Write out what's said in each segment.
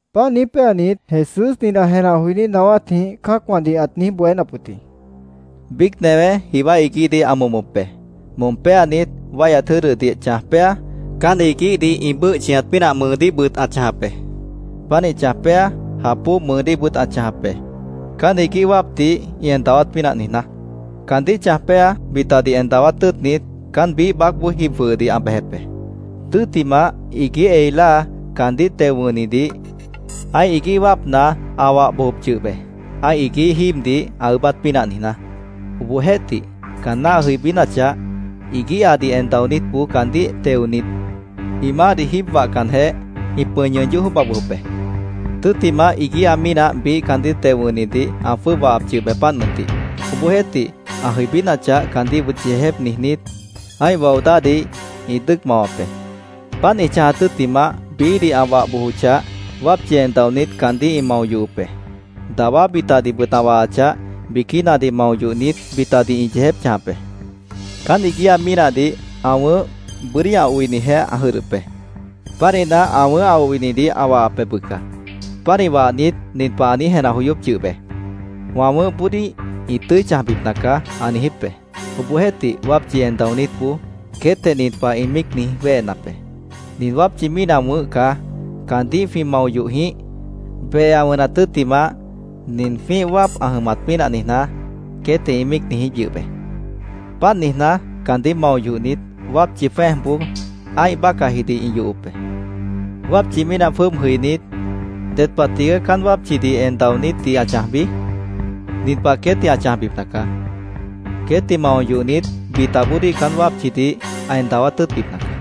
Páant niíj péanit, Jesús nin ã jenah joiní naáwátjĩh cã́acwãdih ãt niíj bohénap wʉt jĩ: “Biíc newé jiwá iguíhdih ã momop be. Mom péanit, wáihyat jʉ́dʉdih chãj péa, caán iguíhdih ĩ bʉ́ʉh chʉñat pínah mʉʉdíhbʉt ã chãjap be. Pánih chãj péa, jap bóo mʉʉdíhbʉt ã chãjap be, caán iguíh wáapdih ĩ en dawát pínah niijná. Caandíh chãj péa, bitadih en dawát tʉ́ʉtnit, caán biíh baácboó jib jwʉhʉdih ã bejep be. Tʉ́ttimah, iguíh ei láa caandíh teo wʉ̃hnidih ã́ih iguíh wáapna ã wah bojop yʉh be, ã́ih iguíh jíibdih ã ʉʉ́bát pínah niijná. Obohjeéhtih, caanná ã jʉibínachah, iguíhadih en daonítboó caandíh teonit, ĩ maáhdih jíib wahcanjeh, ĩ pʉ̃i ñʉʉn yóh jwʉ́ʉba bojop be. Tʉ́ttimah, iguíha mínah biíh caandíh teo wʉ̃hnidih ã jwʉ́ʉb wahap yʉh be, páant mʉntih. Obohjeéhtih, ã jʉibínachah, caandíhbʉt yeejép niijnít, ã́ih wao dáhdih ĩ dʉ́ʉc mawap be. Páant ĩ chãjat tʉ́ttimah, biíhdih ã wah bojochah, wápchi en daonít caandíh ĩ mao yohop be. Dawá bitadihbʉt ã wahachah, biquínadih mao yohnit, bitadih ĩ yeejép chãjap be. “Caán iguíha mínahdih ã wʉ̃ʉ́h, bʉ́dí ã oinijeh ã jʉdhdʉp be. Pánihna, ã wʉ̃ʉ́h ã oinidih ã wahap be, bʉca. Pánih wahnit, nin pah ã niíj jenah joyóp yʉh be: ‘Wã wʉ̃ʉ́hboodíh ĩ tʉ́i chãjbipna caá’, ã niijíp be. Obohjeéhtih, wápchi en daonítboó queétjeh nin pah ĩ míic niíj wéhenap be: ‘Nin wápchi mínah wʉ̃ʉ́h caá. Caandíh jwĩ mao yoh jĩíh, behe ã wʉnat tʉ́ttimah, nin jwĩ́ih wáap ã jʉmat pínah niijná’, queétjeh ĩ míic niijíp yʉh be. Páant niijná, caandíh mao yohnit, wápchi jwẽ́ejboó ã́ih bácahjidih ĩ yohop be. “¿Wápchi mínah jwʉ́ʉb jʉibínit, ded pah tigaá caán wápchidih en daonítdih ã chãjbi? Nin pah queétdih ã chãjbipna caá: Queétdih mao yohnit, bitaboodíh caán wápchidih ã en dawát tʉ́ʉtbipna caá.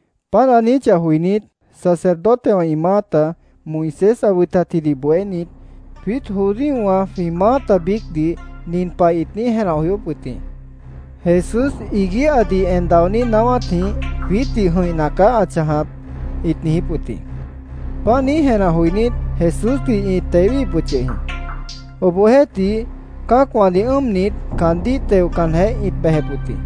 Páant ã niijíchah joinít, sacerdotewã ĩ maáta, Moisés ã wʉtatjidih bohénit, jwiít judíowã jwĩ maáta biícdih nin pah ĩt niíj jenah joyóp wʉt jĩ: “Jesús iguíhadih en daonít naáwátjĩh jwiítdih jʉ̃ihna caá ã chãjap”, ĩt niijíp wʉt jĩ. Páant niíj jenah joinít, Jesúsdih ĩt tewíhip wʉt yʉh jĩ. Obohjeéhtih, cã́acwãdih ʉ́ʉmnit, caandíh teocanjeh, ĩt bejep wʉt jĩ.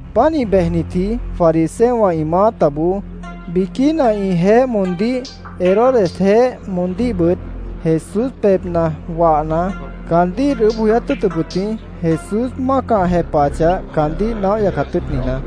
Pánih bejnitji fariseowã ĩ maátaboó biquína ĩjeéh moondíh Herodesjeéh moondíhbʉt, Jesús pebhna wahna, caandíh ĩt ʉʉ́bh joyát tʉ́ʉtʉp wʉt jĩ, Jesús mácah ã jepahachah, caandíh naóh yacat tʉ́ʉt niijná.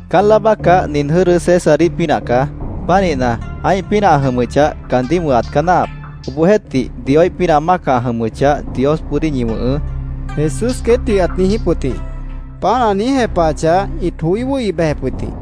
—Caán láa bácah nin jʉ́dʉ Césaríh pínah caá. Pánihna, ã́ih pínah ã jʉmʉchah, caandíh wʉ̃hat caá náahap. Obohjeéhtih, Dioíh pínah mácah ã jʉmʉchah, Diosboodíh ñi wʉ̃hʉʉ́, Jesús queétdih ãt niijíp wʉt jĩ. Páant ã niíj jepahachah, ĩt joí wʉ́hi bejep wʉt jĩ.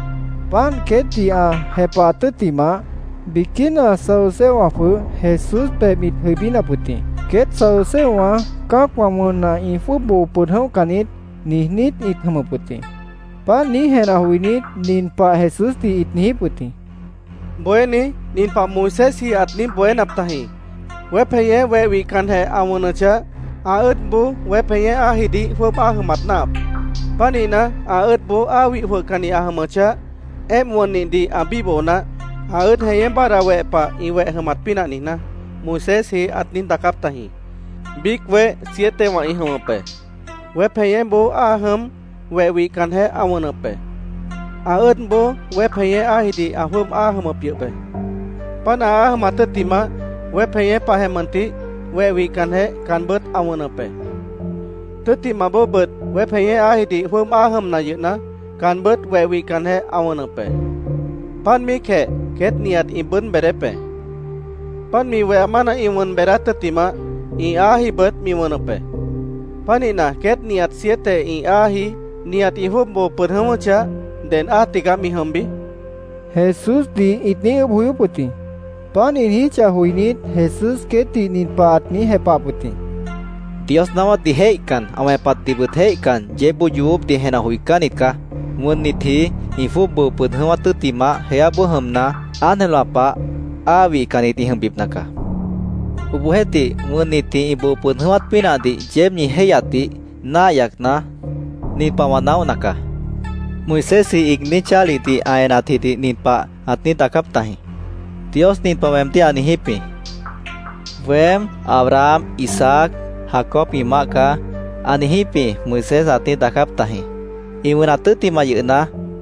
Páant queétdih ã jepahat tʉ́ttimah, biquína saduceowã jwʉh Jesús pebh ĩt jʉibínap wʉt jĩ. Queét saduceowã “Cã́acwã wʉnna, ĩ jwʉ́ʉb boo pʉd jʉ̃óhcan niít”, niijnít ĩ jʉmʉp jĩ. Páant niíj jenah joinít, nin pah Jesúsdih ĩt niijíp wʉt jĩ: —Bohéní, nin pah Moisésji ãt niíj bohénap tajĩ: ‘Weép jeñé weh wihcanjeh ã wʉnʉchah, ã ʉ́ʉdboó weép jeñé áajidih jwʉ́ʉb áa jʉmat náahap. Pánihna, ã ʉ́ʉdboó áa wih jwʉhcanni ã jʉmʉchah, éemp wʉnnihdih ã bíboho naáh, ã ʉ́ʉd jeñé báadhda weh pah ĩ weh jʉmat pínah niijná’, Moisésji ãt niíj daacáp tajĩ. Biíc weh sietewã ĩ jʉmʉp be. Weép jeñéboó áa jʉm, weh wihcanjeh ã wʉnʉp be. Ã ʉ́ʉdboó weép jeñé áajidih ã jwʉ́ʉb áa jʉmʉp yʉh be. Páant áa jʉmat tʉ́ttimah, weép jeñé pahjeh mʉntih, weh wihcanjeh caanbʉ́t ã wʉnʉp be. Tʉ́ttimah bóobʉt weép jeñé áajidih jwʉ́ʉb áa jʉmna yʉhna, caanbʉ́t weh wihcanjeh ã wʉnʉp be. Páant míicjeh queét nihat ĩ bʉʉ́d beedép be. Páant mi weha mána ĩ wʉn beedát tʉ́ttimah, ĩ áajibʉt mi wʉnʉp be. Pánihna, queét nihat siete ĩ áaji, nihat ĩ jwʉ́ʉb boo pʉd jʉ̃ʉ́wʉ́chah, ¿ded áa tigaá mi jʉmbi? Jesúsdih ĩt niíj ʉʉ́bh joyóp wʉt jĩ. Páant ĩ niijíchah joinít, Jesús queétdih nin pah ãt niíj jepahap wʉt jĩ: —Dios naáwátdih jéihcan, ã wẽpatdihbʉt jéihcan, yeébboó yoobópdih jenah joicánnit caá. Wʉnnitji ĩ jwʉ́ʉb boo pʉd jʉ̃ʉ́wát tʉ́ttimah, jeáboó jʉmna, ángelwã pah áa wihcannit ĩ jʉmbipna caá. Obohjeéhtih, wʉnnitji ĩ boo pʉd jʉ̃ʉ́wát pínahdih yeéb ñi jéihyatdih náah yacna, nin pah wã naóhna caá: Moisésji iigní chálihdih ã enatjidih nin pah ãt niíj daacáp tajĩ: ‘Dios nin pah weemdíh ã niijíp jĩ: “Weém Abraham, Isaac, Jacob ĩ Maáh caá”, ã niijíp jĩ’, Moisés ãt niíj daacáp tajĩ. Ĩ wʉnat tʉ́ttimah yʉhna,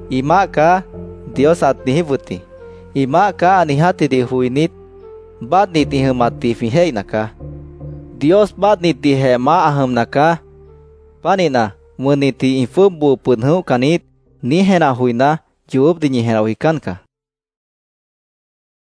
‘Ĩ Maáh caá’, Dios ãt niijíp wʉt jĩ. ‘Ĩ Maáh caá’, ã niijátjidih joinít, báadhnit ĩ jʉmatdih jwĩ jéihna caá. ¡Dios báadhnitdihjeh maáh ã jʉmna caá! Pánihna, ‘Wʉnnitji ĩ jwʉ́ʉb boo pʉd jʉ̃óhcan niít’, niíj jenah joiná, yoobópdih ñi jenah joicán caá, ãt niijíp wʉt jĩ.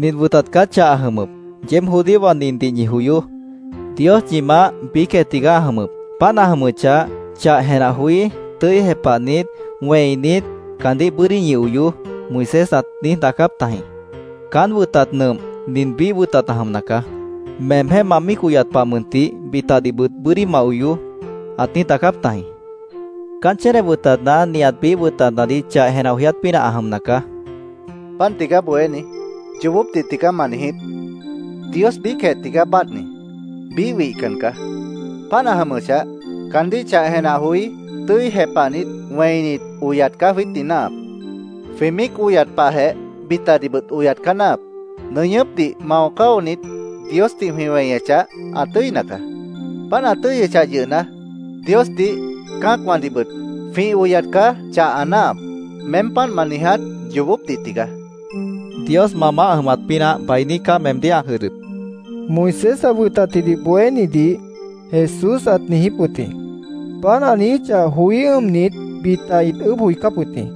—Nin wʉtat caá chah ã jʉmʉp: ‘Yeéb judíowã nindih ñi joyoó: Dios ñi Maáh, biícjeh tigaá ã jʉmʉp. Páant ã jʉmʉchah, chah jenah joí, tʉ́i jepahnit, wẽinit, caandíh bʉ́dí ñi oyoó’, Moisés ãt niíj daacáp tajĩ. Caán wʉtat nʉmp, nin biíh wʉtat ã jʉmna caá. ‘Meemjéh ma míic oyat pah mʉntih, bitadihbʉt bʉ́dí ma oyoó’, ãt niíj daacáp tajĩ.Caán chéne wʉtatna nihat biíh wʉtatnadih chah jenah joyát pínah ã jʉmna caá, Jesús caandíh ãt niijíp wʉt jĩ. —Páant tigaá Bohéní. Yoobópdih tigaá ma niijíp. Dios biícjeh tigaá báadhni. Biíh wihcan caá. Páant ã jʉmʉchah, caandíh chah jenah joí, tʉ́i jepahnit, wẽinit, oyat caá jwiítdih náahap. Jwĩ míic oyat pahjeh bitadihbʉt oyat caá náahap. Nʉñʉ́pdih mao cáonit, Diosdih jwĩ weñechah, ã tʉ́ina caá. Páant ã tʉ́yʉchah yʉhna, Diosdih, cã́acwãdihbʉt jwĩ oyat caá chah ã náahap. Meém páant ma niiját yoobópdih tigaá, Jesúsdih ãt niijíp wʉt jĩ. —Dios ma maáh ã jʉmat pínah bainí caá meemdíh ã jʉdhdʉp, Moisés ã wʉtatjidih bohénidih Jesús ãt niijíp wʉt jĩ. Páant ã niijíchah joí ʉ́ʉmnit, bita ĩt ʉʉ́bh joicáp wʉt jĩ.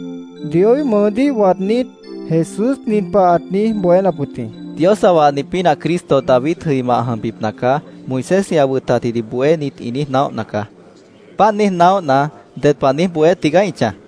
Dioíh mʉʉdíh waadnít, Jesús nin pah ãt niíj bohénap wʉt jĩ: —‘Dios ã wahni pínah Cristo David jʉima ã jʉmbipna caá’, Moisésji ã wʉtatdih bohénit ĩ niíj naóhna caá. ¿Páant niíj naóhna, ded pah niíj bohé tigaá ĩ chãj?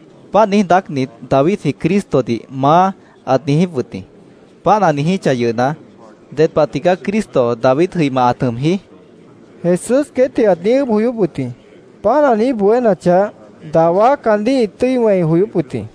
Páant niíj daácnit, Davidji Cristodih ‘Maá’, ãt niijíp wʉt jĩ. Páant ã niijíchah yʉhna, ¿ded pah tigaá Cristo David jʉima ãt jʉmji? Jesús queétdih ãt niíj ʉʉ́bh joyóp wʉt jĩ. Páant ã niíj bohénachah, dawá caandíh ĩt tʉ́i wẽi joyóp wʉt jĩ.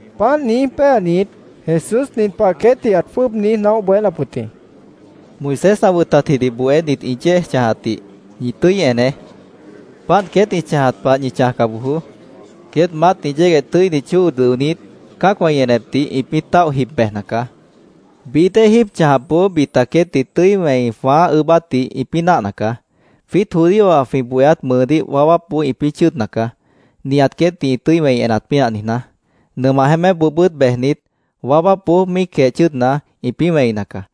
Páant niíj péanit, Jesús nin pah queétdih ãt jwʉ́ʉb niíj naóh bohénap wʉt jĩ: “Moisés ã wʉtatjidih bohénit ĩ yéej chãjatdih ñi tʉ́i eneé. Páant queét ĩ chãjat pah ñi chãjca bojoó. Queét maátni yégueh tʉ́ini chóo dʉonít, cã́acwã ĩ enepdih ĩpĩ́ táoh jib bejna caá. Bií dée jíib chãjapboó bita queétdih tʉ́i wẽi jwãáh ʉʉ́bátdih ĩpĩ́ náahna caá. Jwiít judíowã jwĩ bohéát mʉʉdíh waáwápboó ĩpĩ́ chʉ́ʉdna caá, nihat queétdih ĩ tʉ́i wẽi enat pínah niijná. Nʉmah jeémépboobʉ́t bejnit, waáwápboó míicjeh chʉ́ʉdna, ĩpĩ́ wẽina caá.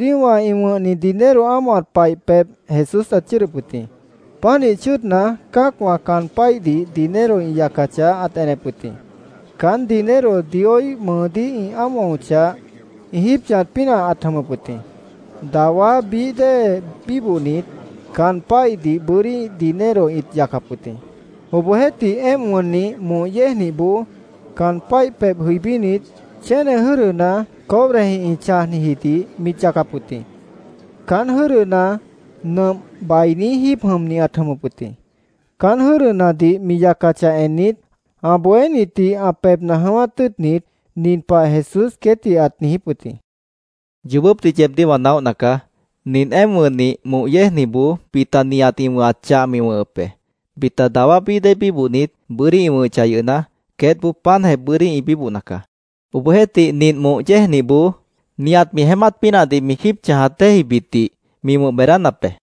Judíowã ĩ wʉ̃hni dinero ámohat paih pebh Jesús ãt chʉ́ʉdʉp wʉt jĩ. Pánih chʉ́ʉdna, cã́acwã caan páihdih dinero ĩ yacachah, ãt enep wʉt jĩ. Caán dinero Dioíh mʉʉdíh ĩ ámohochah, ĩ jíib chãjat pínah ãt jʉmʉp wʉt jĩ. Dawá bií dée bíbohnit caan páihdih bʉ́dí dinero ĩt yacap wʉt jĩ. Obohjeéhtih, éemp wʉnnih moh yéejnihboó caan páih pebh jʉibínit, chéne jʉ́dʉna cobrejĩh ĩ chãjnijidih mit yacap wʉt jĩ. Caán jʉ́dʉna nʉmp bainí jíib jʉmni ãt jʉmʉp wʉt jĩ. Caán jʉ́dʉnadih mi yacachah ennit, ã bohénitdih ã pebhna jʉ̃ʉ́wát tʉ́ʉtnit, nin pah Jesús queétdih ãt niijíp wʉt jĩ: —Yoobópdih yeebdíh wã naóhna caá. Nint éemp wʉnnih moh yéejnihboó bita nihat ĩ wʉ̃hat chah mi wʉ̃hʉp be. Bita dawá bií dée bíbohnit, bʉ́dí ĩ wʉ̃hʉchah yʉhna, queétboó páantjeh bʉ́dí ĩ bíbohna caá. Obohjeéhtih, nint moh yéejnihboó nihat mi jeémát pínahdih mi jíib chãjat déejibitdih mi wʉ̃h beedánap be, ãt niijíp wʉt jĩ.